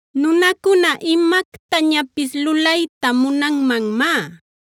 Nunacuna imactañapis lulayta munanmanmá;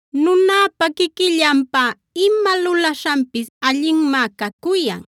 Nunäpa quiquillanpá ima lulaśhanpis allinmá cacuyan;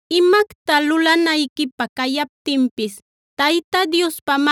Imacta lulanayquipä cayaptinpis Tayta Diospa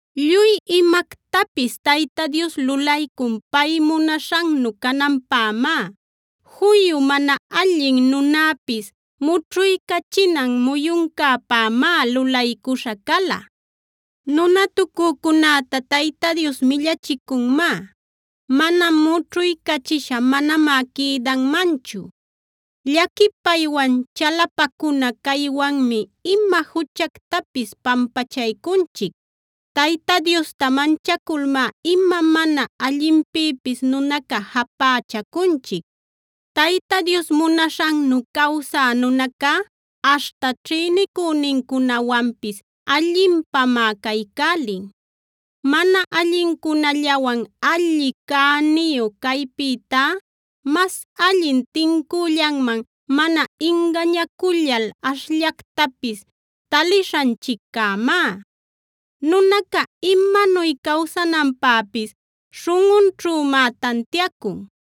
Lluy imactapis Tayta Dios lulaycun pay munaśhannu cananpämá; juyu mana allin nunäpis mućhuycachinan muyuncäpämá lulaycuśha cala. Nunatucücunäta Tayta Dios millachicunmá; mana mućhuycachisha manamá quïdanmanchu. Llaquipaywan, chalapacuna caywanmi ima juchactapis pampachaycunchic; Tayta Diosta manchaculmá ima mana allinpïpis nunaca japächacunchic. Tayta Dios munaśhannu cawsä nunacá aśhta ćhïnicünincunawanpis allinpamá caycälin. Mana allincunallawan alli cäniyu caypïtá mas allin tincüllanman mana ingañacullal ashllactapis talishanchiccämá. Nunaca imanuy cawsananpäpis śhunꞌunćhümá tantiacun.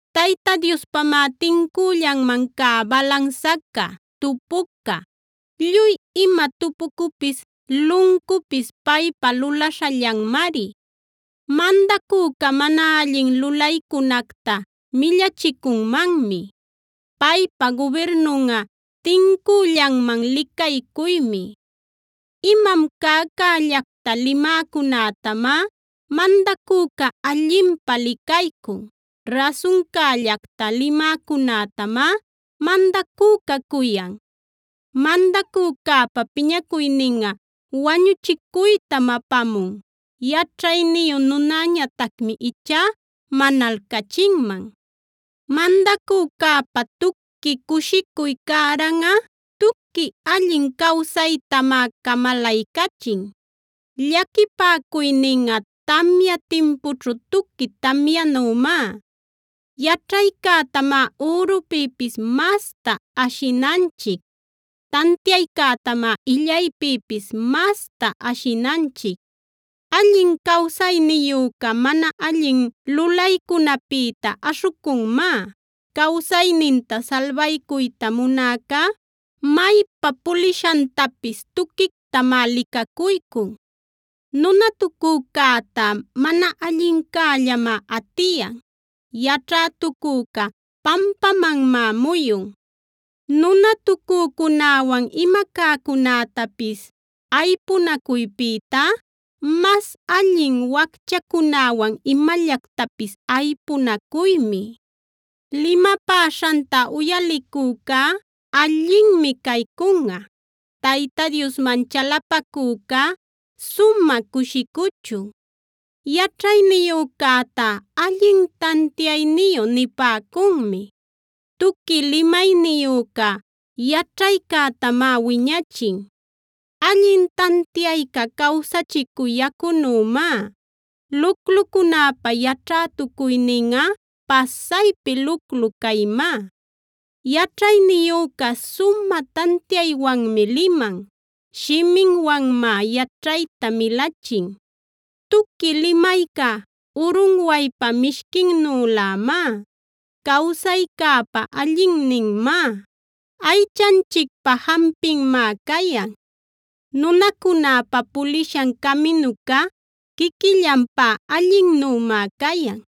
Tayta Diospamá tincüllanman cä balansaca, tupucuca; lluy ima tupucupis, luncupis paypa lulaśhallanmari. Mandacüca mana allin lulaycunacta millachicunmanmi; paypa gubirnunꞌa tincüllanman licaycuymi. Imam cäcällacta limäcunätamá mandacüca allinpä licaycun; rasuncällacta limäcunätamá mandacüca cuyan. Mandacücäpa piñacuyninꞌa wañuchicuytam apamun; yaćhayniyu nunäñatacmi ichá manalcachinman. Mandacücäpa tuqui cushicuy cäranꞌa tuqui allin cawsaytamá camalaycachin; llaquipäcuyninꞌa tamya timpućhu tuqui tamyanümá. Yaćhaycätamá ürupïpis masta ashinanchic; tantiaycätamá illaypïpis masta ashinanchic. Allin cawsayniyüca mana allin lulaycunapïta aśhucunmá; cawsayninta salbaycuyta munäcá maypa pulishantapis tuquictamá licacuycun. Nunatucücäta mana allincällamá atiyan; yaćhätucüca pampamanmá muyun. Nunatucücunäwan ima cäcunätapis aypunacuypïtá mas allin wacchacunäwan imallactapis aypunacuymi. Limapäśhanta uyalicücá allinmi caycunꞌa; Tayta Diosman chalapacücá sumä cushicuchun. Yaćhayniyücäta “allin tantiayniyu” nipäcunmi; tuqui limayniyüca yaćhaycätamá wiñachin. Allin tantiayca cawsachicü yacunümá; luclucunäpa yaćhätucuyninꞌa pasaypi luclu caymá. Yaćhayniyüca sumä tantiaywanmi liman; shiminwanmá yaćhayta milachin. Tuqui limayca urunwaypa mishquinnülämá, cawsaycäpä allinninmá, aychanchicpä jampinmá cayan. Nunacunäpa pulishan caminuca quiquillanpá allinnümá cayan;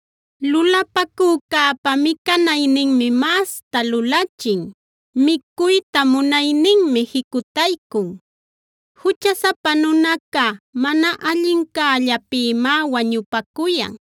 Lulapacücäpa micanayninmi masta lulachin; micuyta munayninmi jicutaycun. Juchasapa nunaca mana allincällapïmá wañupacuyan;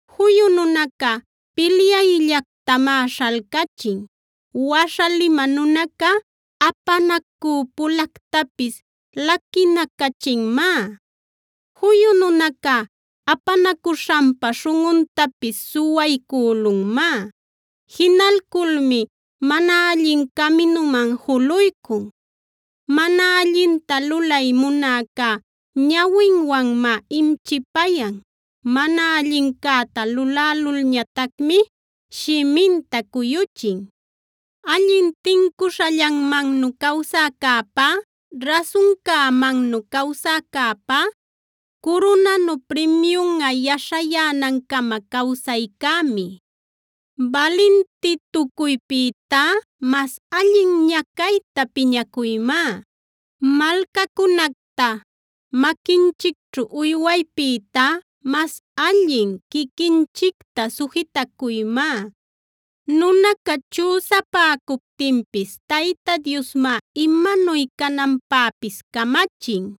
Juyu nunaca pilyayllactamá śhalcachin; waśha limä nunaca, apanacü pulactapis laquinacachinmá. Juyu nunaca apanacuśhanpa śhunꞌuntapis suwaycülunmá; jinalculmi mana allin caminuman juluycun. Mana allinta lulay munäca ñawinwanmá imchipayan; mana allincäta lulälulñatacmi shiminta cuyuchin. Allin tincuśhallanmannu cawsäcäpá, rasuncämannu cawsäcäpá, curunanu primiyunꞌa yaśhayänancama cawsaycämi. Balintitucuypïtá mas allin ñacayta piñacuymá; malcacunacta maquinchicćhu uywaypïtá mas allin quiquinchicta sujitacuymá. Nunaca chüsapäcuptinpis Tayta Diosmá imanuy cananpäpis camachin.